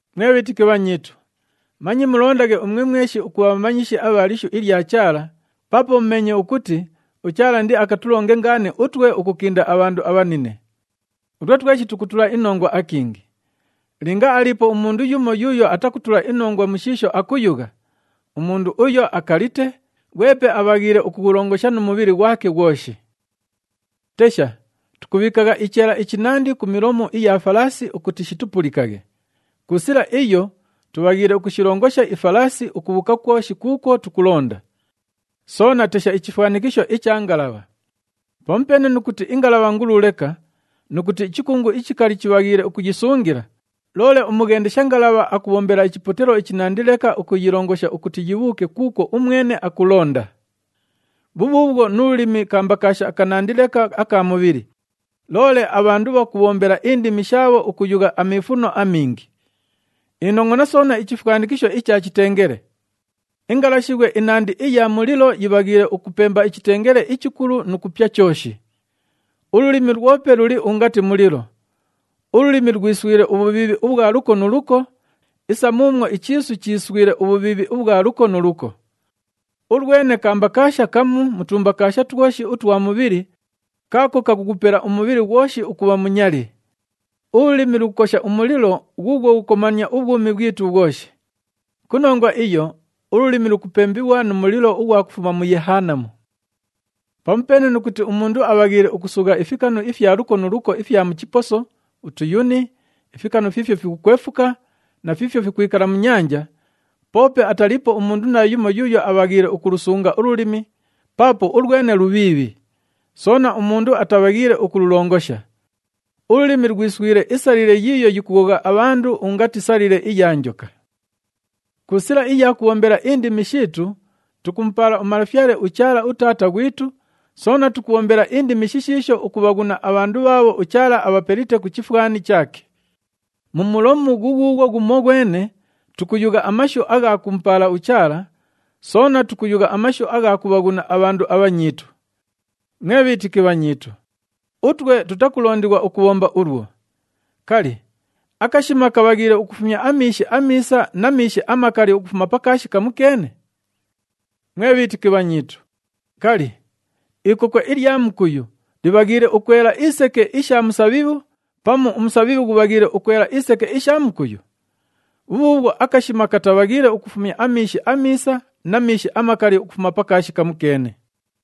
Mwe bhiitiki bhanyiitu, manye mulondaghe umwe mweshi ukubha bhamanyishi abha lishu ilya Chaala, paapo mumeenye ukuti uChaala indiakatulonge ngaani utwe ukukinda abhandu abhanine. Utwe tweshi tukutula inongwa akingi. Linga aliipo umundu yumo yuuyo atakutula inongwa mu shiisho akuyugha, umundu uyo akalite, ghwepe abhaghiile ukughulongosha nu mubhili ghwake ghwoshi. Tesha, tukubhiikagha icheela ichinandi ku milomu iya falaasi ukuti shitupulikaghe. Ku sila iyo tubhaghiile ukushilongosha ifalaasi ukubhuuka kwoshi kuukwo tukulonda. Soona tesha ichifwanikisho icha ngalabha. Pamupeene nu kuti ingalabha ngulu leka nu kuti ichikungu ichikali chibhaghiile ukuyisungila, loole umughendesha ngalabha akubhombela ichipotelo ichinandi leka ukuyilongosha ukuti yibhuuke kuukwo umwene akulonda. Bhubhuubhwo nu lulimi kambakaasha kanandi leka aka mubhili, loole abhandu bhakubhombela indimi shaabho ukuyugha amiifuno amingi. Inongʼona soona ichifwanikisho icha chitengele. Ingalashibhwe inandi iya mulilo yibhaghiile ukupemba ichitengele ichikulu nu kupya chooshi. Ululimi lwope luli ungati mulilo. Ululimi lwiswile ubhubhiibhi ubhwa luko nu luko isa muumwo ichiisu chiiswile ubhubhiibhi ubhwa luko nu luko. Ulwene kambakaasha kamu mu tumbakaasha twoshi utwa mubhili kaako kakughupela umubhili ghwoshi ukubha munyali. Ululimi lukukosha umulilo ghuughwo ghukukomania ubhwumi bhwitu bhwoshi. Ku nongwa iyo, ululimi lukupembighwa nu mulilo ughwa kufuma mu Yehanamu. Pamupeene nu kuti umundu abhaghiile ukusugha ifikanu ifya luko nu luko ifya mu chiposo, utuyuni, ifikanu fiifyo fikukwefuka na fiifyo fikwikala mu nyanja, poope ataliipo umundu naayumo yuuyo abhaghiile ukulusunga ululimi paapo ulwene lubhiibhi, soona umundu atabhaghiile ukululongosha. Ululimi lwiswile isalile yiiyo yikughogha abhandu ungati salile iya njoka. Ku sila iya kubhombela indimi shiitu, tukumupaala uMalafyale uChaala uTaata ghwitu, soona tukubhombela indimi shishiisho ukubhaghuna abhandu bhaabho uChaala abhapelite ku chifwani chaake. Mu mulomu ghughuughwo ghumoghwene tukuyugha amashu agha kumupaala uChaala, soona tukuyugha amashu agha kubhaghuna abhandu abhanyiitu. Mwe bhiitiki bhanyiitu, utwe tutakulondighwa ukubhomba ulwo. Kali, akashima kabhaghiile ukufumya amiishi amiisa na miishi amakali ukufuma pa kaashi kamukeene? Mwe bhiitiki bhanyiitu, kali, ikokwe ilya mukuyu libhaghiile ukwela iseke isha musabhibhu pamu umusabhibhu ghubhaghiile ukwela iseke isha mukuyu? Bhubhuubhwo akashima katabhaghiile ukufumya amiishi amiisa na miishi amakali ukufuma pa kaashi kamukeene.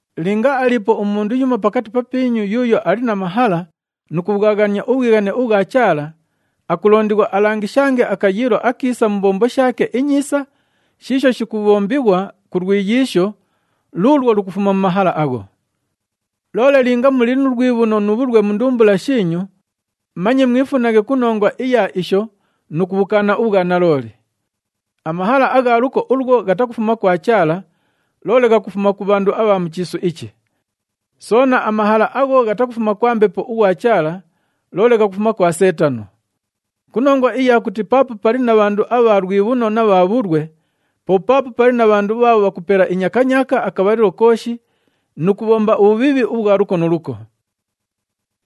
Linga aliipo umundu yumo pakati papiinyu yuuyo ali na mahala nu kubhwaghania ubhwighane ubhwa Chaala, akulondighwa alangishange akayiilo akiisa mu mbombo shaake inyiisa shiisho shikubhombighwa ku lwiyiisho luulwo lukufuma mu mahala agho. Loole linga muli nu lwibhuno nu bhulwe mu ndumbula shiinyu, manye mwifunaghe ku nongwa iya isho nu kubhukaana ubhwanalooli. Amahala agha luko ulwo ghatakufuma kwa Chaala, loole ghakufuma ku bhandu abha mu chiisu ichi. Soona, amahala agho ghatakufuma kwa Mbepo ughwa Chaala, loole ghakufuma kwa Seetano. Ku nongwa iya kuti paapo pali na bhandu abha lwibhuno na bha bhulwe, po paapo pali na bhandu bhaabho bhakupela inyakanyaaka akabhalilo kooshi nu kubhomba ubhubhiibhi ubhwa luko nu luko.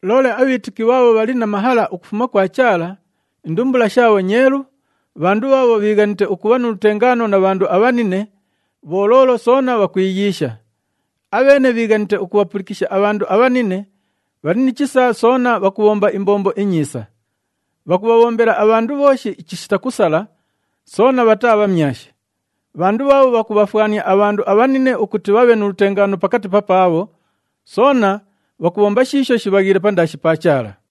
Loole abhiitiki bhaabho bhali na mahala ukufuma kwa Chaala, indumbula shaabho nyeelu, bhandu bhaabho bhiighanite ukubha nu lutengaano na bhandu abhanine, bholoolo soona bhakwiyiisha. Abheene bhiighanite ukubhapulikisha abhandu abhanine, bhali ni chisa soona bhakubhomba imbombo inyiisa. Bhakubhabhombela abhandu bhooshi chishita kusala, soona bhataa bhamyashi. Bhandu bhaabho bhakubhafwania abhandu abhanine ukuti bhabhe nu lutengaano pakati papaabho, soona bhakubhomba shiisho shibhaghiile pandaashi pa Chaala.